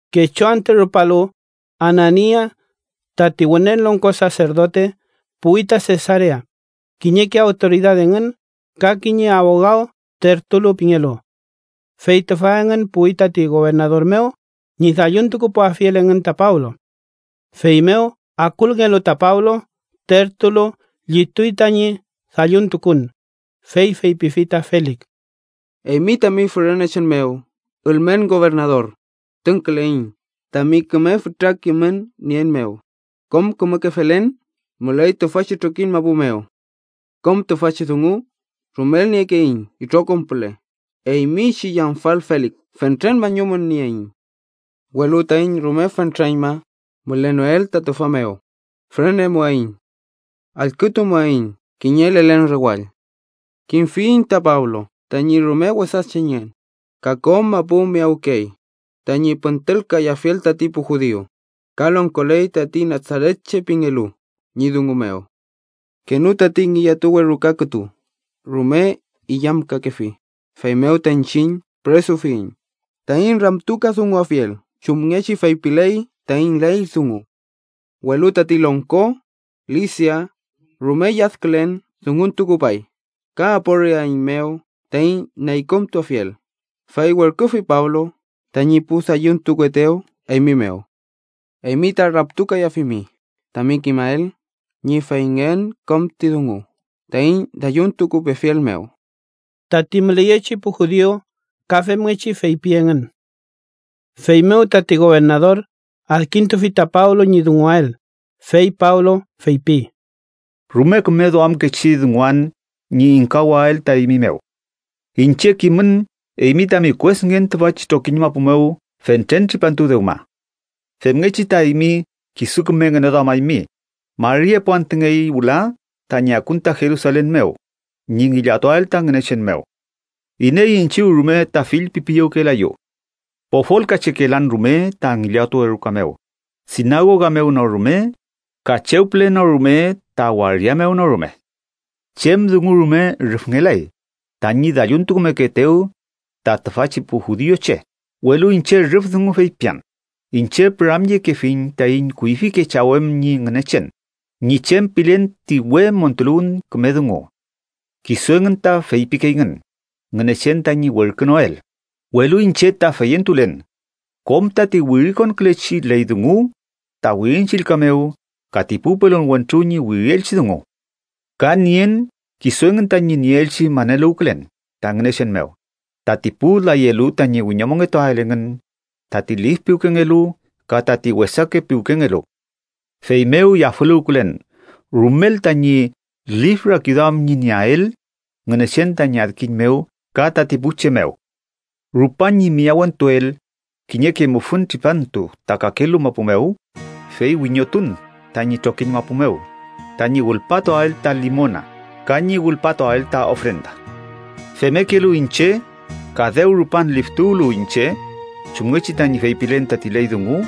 Kechu antü rupalu, Anania, tati Wünen Longko Saserdote, puwi ta Sesarea, kiñeke awtoridad engün ka kiñe abogaw Tertulo pingelu. Fey tüfa engün puwi tati gobernador mew ñi dalluntukupuafiel engün ta Pablo. Feymew akulngelu ta Pablo, Tertulo llituy tañi dalluntukun, fey feypifi ta Felik: —Eymi tami fürenechen mew, ülmen gobernador, tüngküleiñ, tami küme fütra kimün nien mew kom kümeke felen müley tüfachi trokiñ mapu mew. Kom tüfachi dungu rumel niekeiñ itrokom püle, eymi chi yamfal Felik, fentren mañumün nieiñ. Welu taiñ rume fentreñma mülenoael ta tüfa mew, fürenemuaiñ. Allkütumuaiñ kiñe lelen rewall. Kimfiyiñ ta Pablo tañi rume wesa chengen, ka kom mapu miyawkey tañi püntülkayafiel tati pu judiu, ka longkoley tati Nasaretche pingelu ñi dungu mew. Kenü tati ngillatuwe ruka kütu rume illamkakefi, feymew ta iñchiñ püresufiyiñ taiñ ramtukadunguafiel chumngechi feypiley taiñ ley dungu. Welu tati longko Lisia rume lladkülen dunguntukupay ka aporiaeiñmew taiñ neykümtuafiel, fey werküfi Pablo tañi pu dalluntukuetew eymi mew. Eymi ta ramtukayafimi tami kimael ñi feyngen kom ti dungu taiñ dalluntukupefiel mew. Tati müleyechi pu judiu ka femngechi feypi engün. Feymew tati gobernador adkintufi ta Pablo ñi dunguael, fey Pablo feypi: —Rume küme duamkechi dunguan ñi ingkawael ta eymi mew. Iñche kimün eymi tami kuesngen tüfachi trokiñ mapu mew fentren tripantu dewma. Femngechi ta eymi kisu küme ngüneduamaymi, mari epu antüngey wüla tañi akun ta Jerusalen mew, ñi ngillatuael ta Ngünechen mew. Iney iñchiw rume ta fillpipiyewkelayu. Pofolkachekelan rume ta ngillatuwe ruka mew, sinagoga mew no rume, ka chew püle no rume ta waria mew no rume. Chem dungu rume rüfngelay tañi dalluntukumekeetew ta tüfachi pu judiuche. Welu iñche rüf dungu feypian: iñche püramyekefiñ taiñ kuyfike chaw em ñi Ngünechen ñi chem pilen ti we montuluwün küme dungu. Kisu engün ta feypikeyngün: Ngünechen tañi werkünoel, welu iñche ta feyentulen kom tati wirikonkülechi ley dungu ta Wirin Chillka mew ka ti pu pelon wentru ñi wirielchi dungu. Ka nien kisu engün tañi nieelchi maneluwkülen ta Ngünechen mew tati pu layelu tañi wiñomongetuael engün tati lif piwkengelu ka tati wesake piwkengelu. Feymew yafüluwken rumel tañi lif rakiduam ñi nieael Ngünechen tañi adkiñ mew ka tati pu che mew. Rupan ñi miyawentuel kiñeke mufün tripantu ta kakelu mapu mew, fey wiñotun tañi trokiñ mapu mew tañi wülpatuael ta limona ka ñi wülpatuael ta ofrenda. Femmekelu iñche, ka dew rupan liftuwtulu iñche chumngechi tañi feypilen tati ley dungu,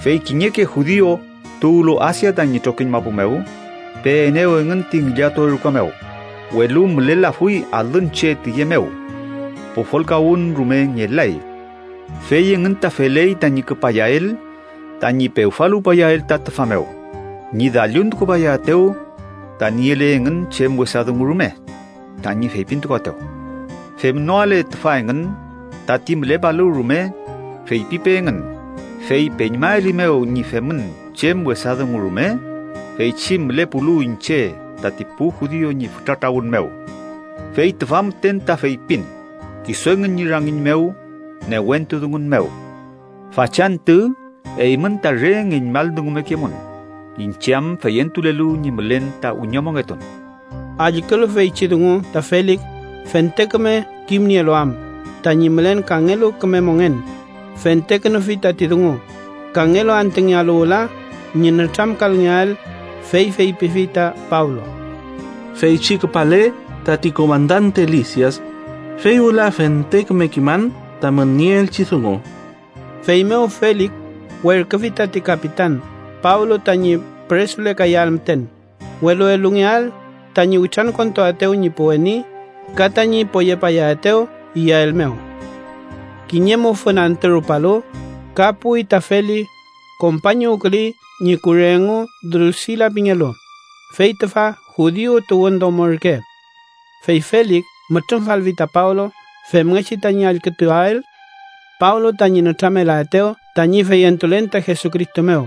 fey kiñeke judiu tuwlu Asia tañi trokiñ mapu mew peenew engün ti ngillatuwe ruka mew, welu mülelafuy alün che tiye mew. Pofolkawün rume ngelay. Fey engün ta feley tañi küpayael tañi pewfaluwpayael ta tüfa mew ñi dalluntukupayaetew ta niele engün chem wesa dungu rume tañi feypintukuaetew. Femnoale tüfa engün, tati mülepalu rume feypipe engün fey peñmaelimew ñi femün chem wesa dungu rume feychi mülepulu iñche tati pu judiu ñi fütra trawün mew. Fey tüfa müten ta feypin kisu engün ñi rangiñ mew newentu dungun mew: ‘Fachantü eymün ta re ngeñmaldungumekemun iñche am feyentulelu ñi mülen ta wiñomongetun.’ Allkülu feychi dungu ta Felik fente küme kimnielu am tañi mülen kangelu küme mongen, fentekünufi tati dungu, kangelu antüngealu wüla ñi nütramkalngeael, fey feypifi ta Pablo: —Feychi küpale tati komandante Lisias, fey wüla fente küme kiman tamün nieelchi dungu. Feymew Felik werküfi tati kapitan Pablo tañi püresulekayael müten, welu elungeael tañi witrankontuaetew ñi pu weni ka tañi poyepayaetew iyael mew. Kiñe mufün antü rupalu, ka puwi ta Felik, kompañuwküley ñi kure engu Drusila pingelu, fey tüfa judiu tuwün domo ürke. Fey Felik mütrümfalfi ta Pablo, femngechi tañi allkütuael Pablo tañi nütramelaetew tañi feyentulen ta Jesucristo mew.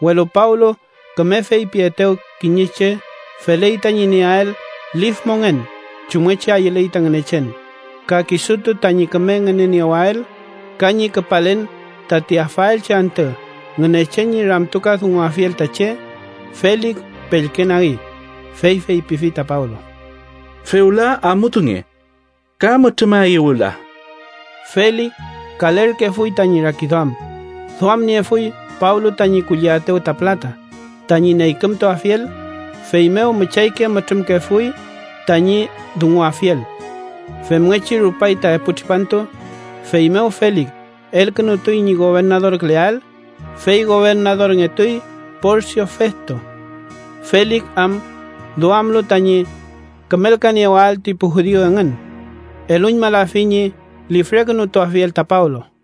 Welu Pablo küme feypietew kiñe che feley tañi nieael lif mongen chumngechi ayüley ta Ngünechen, ka kisutu tañi küme ngüneniewael ka ñi küpalen tati afaelchi antü Ngünechen ñi ramtukadunguafiel ta che, Felik pellkenagi, fey feypifi ta Pablo: —Fewla amutunge. Ka mütrümaeyu wüla. Felik kalerkefuy tañi rakiduam, duamniefuy Pablo tañi kulliaetew ta pülata, tañi neykümtuafiel, feymew müchayke mütrümkefuy tañi dunguafiel. Femngechi rupay ta epu tripantu, feymew Felik elkünutuy ñi gobernadorküleael, fey gobernadorngetuy Porsio Festo. Felik am duamlu tañi kümelkaniewael ti pu judiu engün, eluñmalafi ñi lifrekünutuafiel ta Pablo.